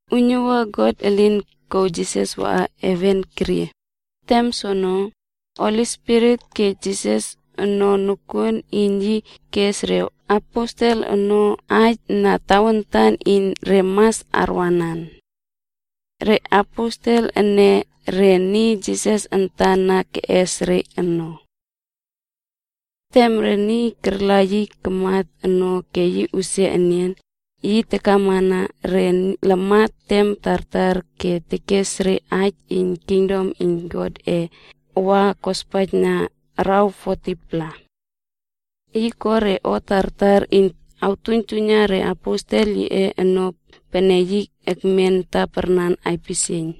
Uiynuwua God elin kouw Jisas waꞌa heven kerie, tem soono, Holi Spirit kej Jisas ono nokuon iyn yi kes reaposelb ono aij na tawantan iyn re mas arwanan. Re aposel ene, re niy Jisas antan na keꞌes re ono. Tem re niy karla yi kamat ono ke yi usia enian, yi takamana re lamat tem tartar ke yi tekes re aij iyn kingdom iyn Godꞌe wa kospaijna araw 40-pla. Yi ko re o tartar iyn awtuiynjuiyna re aposel yiꞌe ono pene yi ekmen taparnan aipisieiyn.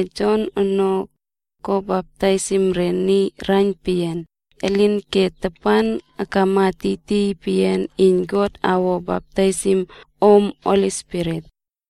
Kopene Jon ono, ko baptaisim re niy raiyn peyian, elinke tapan akama tiytiy peyian iyn God awo baptaisim om Holi Spirit.”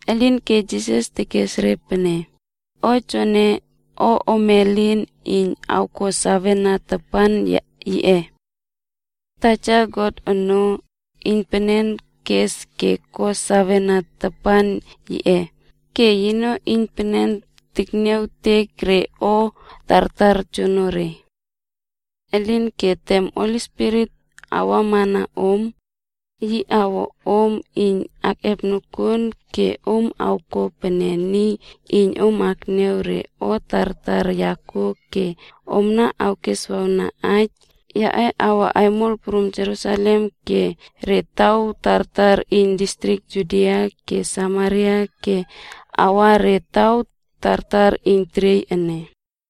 Elinke Jisas tekes re pene, “O joene, o ome elin iyn awko sawena tapan yiꞌe. Taja God ono, iynpenen keꞌes ke ko sawena tapan yiꞌe ke yino iynpenen tekniawtek re o tartar joonore. Elinke tem Holi Spirit awamana om, yi awej om nokuon ke om awko pene niy iyn keniaw re o tartar ya kuo ke omna niy iyn awkeswawna aij yaꞌe awa aimol prum Jerusalem ke re taw tartar iyn distrik Judia ke Samaria ke awa re taw tartar iyn teriey ene.”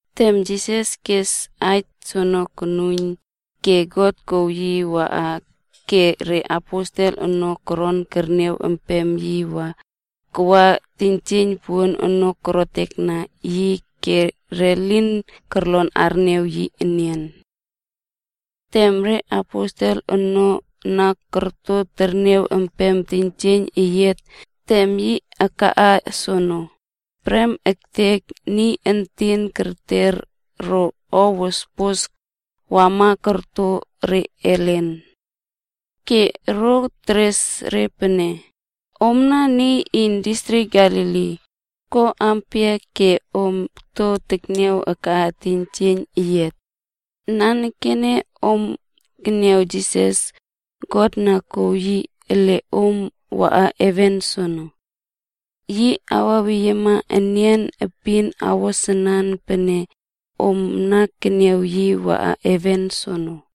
Tem Jisas kes aij soene konuiyn, ke God kouw yi waꞌa ke re aposel ono koron kerniaw empem yi waꞌa wa teiynjieiyn puon ono korotekna yi ke re lin kolon arniaw yi enian. Tem re aposel ono na korto terniaw empem teiynjieiyn eyiat tem yi akaꞌa soono, prem ektek niy entin kerter ro o wospos wama korto re ellen. Ke ro teres re pene, “Omna niy iyn distrik Galili, ko ampia ke om to tekniaw akaꞌa teiynjieiyn eyiat? Nanekene om keniaw Jisas, God na kouw yi ele om waꞌa heven soene. Yi awaweyiema enian epin awo sanan pene om na keniaw yi waꞌa heven soono.”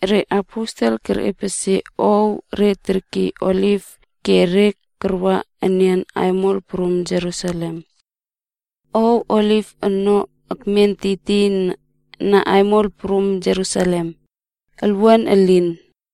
Re aposel kerꞌepesie ow re terkiy Oliv ke re karwa enian aimol prum Jerusalem. Ouw Oliv ono ekmen tiytiyna aimol prum Jerusalem, olwuan elin.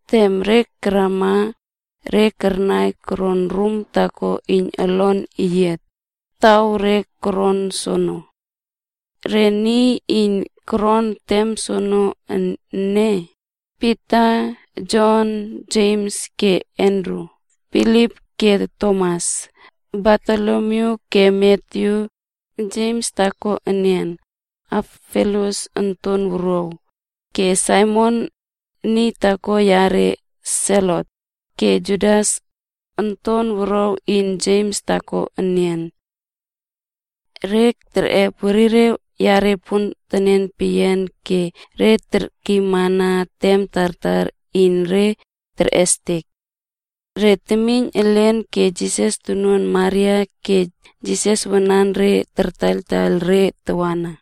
Tem re karama, re karai karaꞌa rum taako iyn olon eyiat,e taw re toron soono. Re niy iyn koron tem soono ene: Pita, Jon, Jems ke Andru, Filip ke Tomas, Bartolomyu ke Matyu, Jems taako enian (Alfius onton wuruaw) ke Saimon (niy taako yare Selot)f ke Judas, onton wuruaw iyn Jems taako enian. Re kerꞌep werire yare pontenen peyian ke re termenmana tem tartar iyn re terꞌestek. Re temiyn elen ke Jisas tonuan Maria ke Jisas wananre kartaiyltaiyl re tawana.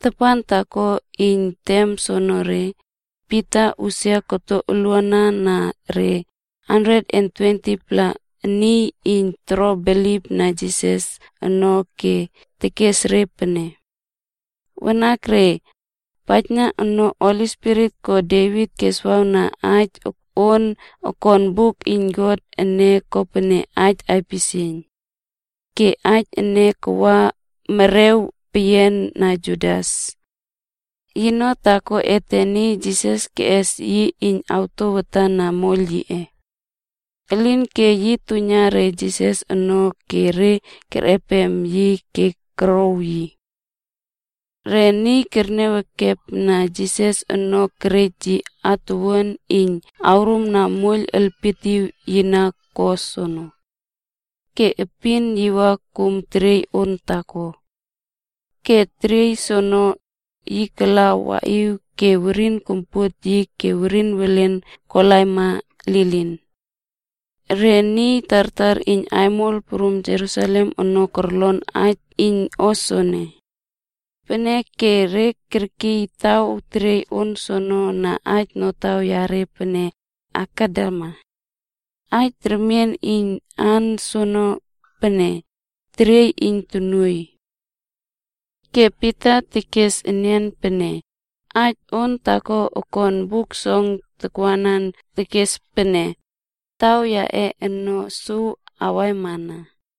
Tapan taako iyn tem soonore, Pita usia koto uluana na re 120-pla niy iyn toro bilipna Jisas ono ke yi tekes re pene, “Wanakre, paijna no, Holi Spirit ko Devit keswawna aij on okon buk iyn God ene kopene aij aipisieiyn. Ke aij ene kawa merꞌer peyian na Judas. Yino taako ete iyn Jisas keꞌes yi iyn atouwmana moiyl yiꞌe. Elinke yi tuiyna re Jisas ono ke re kerꞌep yi ke korow yi.” Re niy terniaw ekepna Jisas ono kerej yi atuwuan, iyn korumna moiyl elpietiw yi na ko soono. Ke epin yi wa kum teriey on taako. Ke teriey soono, yi kala waꞌiw ke werin kompuot ke werin welen kolaima lilin. Re niy tartar iyn aimol prum Jerusalem ono korlon aij iyn o soene. Peneke re kerkiy taw teriey on soono na aij notaw reꞌe pene “Akeldama.” Aij remien iyn aan soene pene, “Teriey iyn Tonuoiy.” Ke Pita tekes enian pene, “Aij on taako okon Buk Song tawana tekes pene, ‘Taw yiꞌe ono suw awaimana,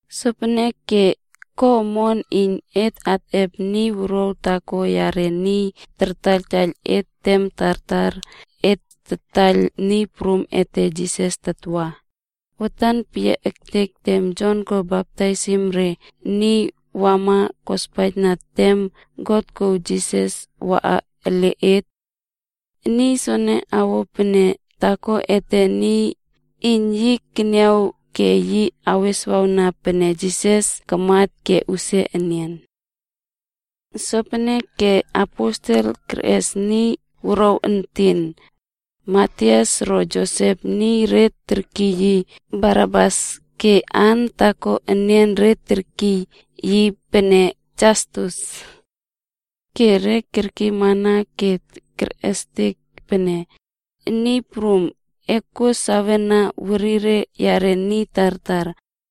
Sopeneke ko omon iyn et atꞌep niy wuruaw taako yare niy kartaiyl et tem tartar et tataiyl Niy Prum ete Jisas tatwa, watan peyiaktek tem Jon ko baptaisim re niy wama kospaijna tem God kouw Jisas waꞌa ele et. Niy soene awo pene taako ete iyn yi keniaw ke yi aweswawna pene Jisas kamat ke usia enian.” Sopeneke re aposel kerꞌes niy wuruaw entin, Matias ro Josep niy re terkiy yi Barsabas ke aan taako enian re terkiy yi pene Jastus. Ke re kerkiymana ke kerꞌestek pene, “Niy Prum, e kuo sawe na werire yare niy tartar.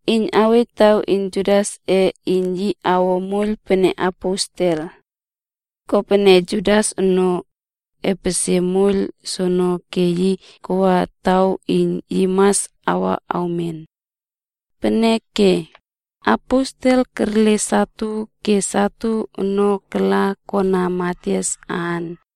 iyn awej taw iyn Judasꞌe, iyn yi awo moiyl pene aposel. Kopene Judas ono, epesie moiyl soene ke yi kawa taw iyn yi mas wa awmen.” Peneke re aposel kerle satu, ke satu ono kala kona Matias aan.